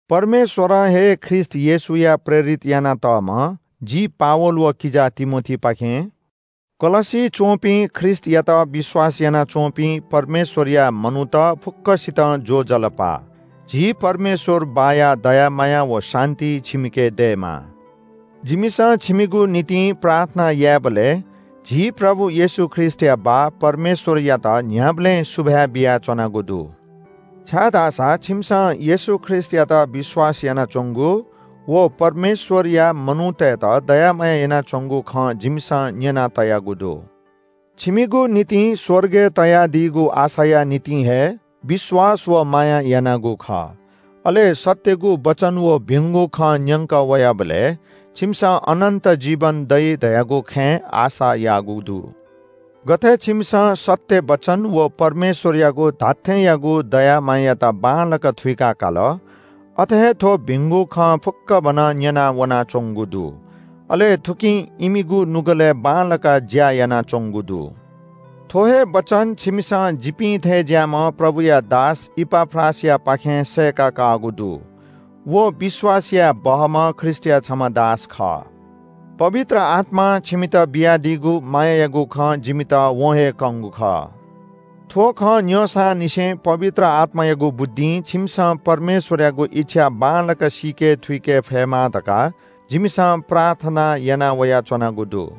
परमेश्‍वरं हे ख्रीष्‍ट येशूया प्रेरित यानातःम्‍ह जि पावल व किजा तिमोथीपाखें कलस्‍सी च्‍वंपिं ख्रीष्‍टयात विश्‍वास यानाच्‍वंपिं परमेश्‍वरया मनूत फुक्‍कसितं ज्‍वजलपा! झी परमेश्‍वर बाःया दया माया व शान्‍ति छिमिके दयेमा। जिमिसं छिमिगु निंतिं प्रार्थना यायेबलय् झी प्रभु येशू ख्रीष्‍टया बाः परमेश्‍वरयात न्‍ह्याबलें सुभाय् बियाच्‍वनागु दु। छाय्‌धाःसा छिमिसं येशू ख्रीष्‍टयात विश्‍वास यानाच्‍वंगु व परमेश्‍वरया मनूतय्‌त दया माया यानाच्‍वंगु खँ जिमिसं न्‍यना तयागु दु। छिमिगु निंतिं स्‍वर्गय् तयादीगु आशाया निंतिं हे विश्‍वास व माया यानागु खः। अले सत्‍यगु वचन व भिंगु खँ न्‍यंकः वयाबलय् छिमिसं अनन्‍त जीवन दइ धयागु खँय् आशा याःगु दु। गथे छिमिसं सत्‍य वचन व परमेश्‍वरयागु धात्‍थेंयागु दया मायायात बांलाक थुइका काल, अथे हे थ्‍व भिंगु खँ फुक्‍कभनं न्‍यनावनाच्‍वंगु दु। अले थुकिं इमिगु नुगलय् बांलाक ज्‍या यानाच्‍वंगु दु। थ्‍व हे वचन छिमिसं जिपिं थें ज्‍याःम्‍ह प्रभुया दास इपाफ्रासयापाखें सय्‌का काःगु दु। व विश्‍वास याये बहःम्‍ह ख्रीष्‍टया छम्‍ह दास खः। पवित्र आत्‍मां छिमित बियादीगु मायायागु खँ जिमित वं हे कंगु खः। थ्‍व खँ न्‍यंसांनिसें पवित्र आत्‍मायागु बुद्धिं छिमिसं परमेश्‍वरयागु इच्‍छा बांलाक सीके थुइके फयेमा धकाः जिमिसं प्रार्थना याना वयाच्‍वनागु दु।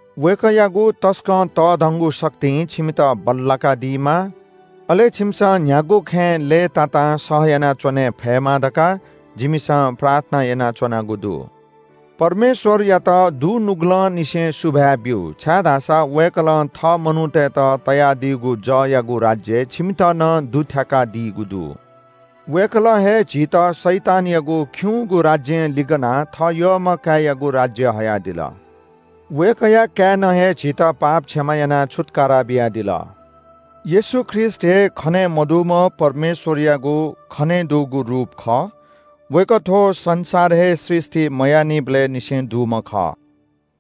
वय्‌कःयागु तसकं तःधंगु शक्तिं छिमित बल्‍लाकादीमा, अले छिमिसं न्‍ह्यागु खँय् लय्‌तातां सहयाना च्‍वने फयेमा धकाः जिमिसं प्रार्थना यानाच्‍वनागु दु। परमेश्‍वरयात दुनुगलंनिसें सुभाय् ब्‍यु, छाय्‌धाःसा वय्‌कलं थः मनूतय्‌त तयादीगु जःयागु राज्‍यय् छिमित नं दुथ्‍याकादीगु दु। वय्‌कलं हे झीत शैतानयागु खिउँगु राज्‍यं लिगनाः थः यःम्‍ह काय्‌यागु राज्‍यय् हयादिल। वय्‌कःया काय्‌नं हे झीत पाप क्षमा यानाः छुत्‍कारा बियादिल। येशू ख्रीष्‍ट हे खने मदुम्‍ह परमेश्‍वरयागु खनेदुगु रूप खः। वय्‌कः थ्‍व संसार हे सृष्‍टि मयाःनिबलय् निसें दुम्‍ह खः।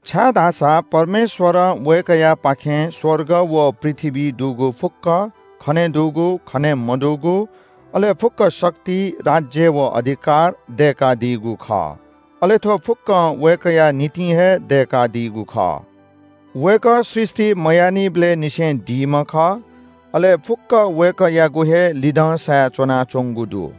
छाय्‌धाःसा परमेश्‍वरं वय्‌कःयापाखें स्‍वर्ग व पृथ्‍वीइ दुगु फुक्‍कं, खनेदुगु, खने मदुगु, अले फुक्‍क शक्ति, राज्‍य व अधिकार दय्‌कादीगु खः। अले थ्‍व फुक्‍कं वय्‌कःया निंतिं हे दय्‌कादीगु खः। वय्‌कः सृष्‍टि मयाःनिबलय् निसें दीम्‍ह खः। अले फुक्‍क वय्‌कःयागु हे लिधंसाय् च्‍वनाच्‍वंगु दु।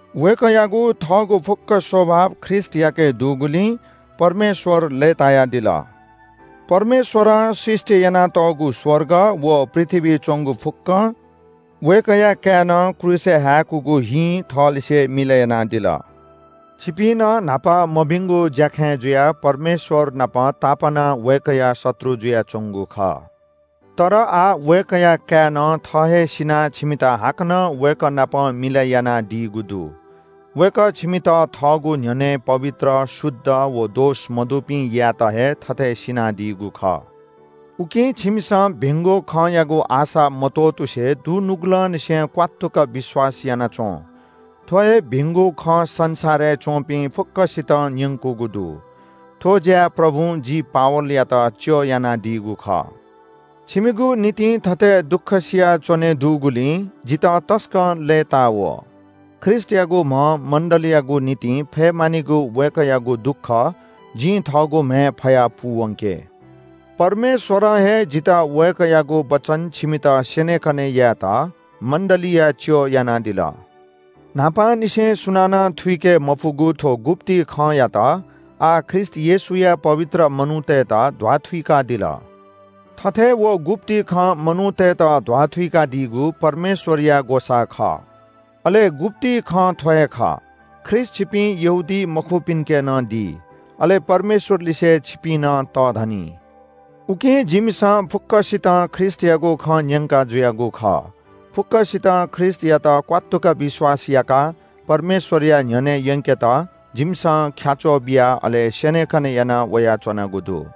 वय्‌कःयागु थःगु फुक्‍क स्‍वभाव ख्रीष्‍टयाके दुगुलिं परमेश्‍वर लय्‌तायादिल। परमेश्‍वरं सृष्‍टि यानातःगु स्‍वर्ग व पृथ्‍वीइ च्‍वंगु फुक्‍कं वय्‌कःया काय्‌नं क्रूसय् हाय्‌कूगु हिं थःलिसे मिलय् यानादिल। छिपिं नं न्‍हापा मभिंगु ज्‍याखँय् जुयाः परमेश्‍वर नाप तापानाः वय्‌कःया शत्रु जुयाच्‍वंगु खः। तर आः वय्‌कःया काय्‌नं थः हे सिनाः छिमित हाकनं वय्‌कः नाप मिलय् यानादीगु दु। वय्‌कः छिमित थःगु न्‍ह्यःने पवित्र, शुद्ध व दोष मदुपिं यायेत हे थथे सिनादीगु खः। उकिं छिमिसं भिंगु खँयागु आशा मत्‍वःतुसे दुनुगलंनिसें क्‍वात्तुक विश्‍वास याना च्‍वँ। थ्‍व हे भिंगु खँ संसारय् च्‍वंपिं फुक्‍कसितं न्‍यंकूगु दु। थ्‍व ज्‍याय् प्रभुं जि पावलयात च्‍यः यानादीगु खः। छिमिगु निंतिं थथे दुःखसिया च्‍वने दुगुलिं जितः तसकं लय्‌ता वः। ख्रीष्‍टयागु म्‍ह मण्‍डलीयागु निंतिं फये मानिगु वय्‌कःयागु दुःख जिं थःगु म्‍हय् फयाः पूवंके। परमेश्‍वरं हे जितः वय्‌कःयागु वचन छिमित स्‍यनेकने यायेत मण्‍डलीया च्‍यः यानादिल। न्‍हापांनिसें सुनानं थुइके मफुगु थ्‍व गुप्‍ति खँयात आः ख्रीष्‍ट येशूया पवित्र मनूतय्‌त ध्‍वाथुइकादिल। थथे व गुप्‍ति खँ मनूतय्‌त ध्‍वाथुइकादीगु परमेश्‍वरया ग्‍वसाः खः। अले गुप्‍ति खँ थ्‍व हे खः – “ख्रीष्‍ट छिपिं यहूदीमखुपिन्‍के नं दी। अले परमेश्‍वरलिसे छिपिं नं तःधनी।” उकिं जिमिसं फुक्‍कसितं ख्रीष्‍टयागु खँ न्‍यंका जुयागु खः। फुक्‍कसितं ख्रीष्‍टयात क्‍वात्तुक विश्‍वास याकाः परमेश्‍वरया न्‍ह्यःने यंकेत जिमिसं ख्‍याच्‍वः बिया अले स्‍यनेकने यानाः वयाच्‍वनागु दु।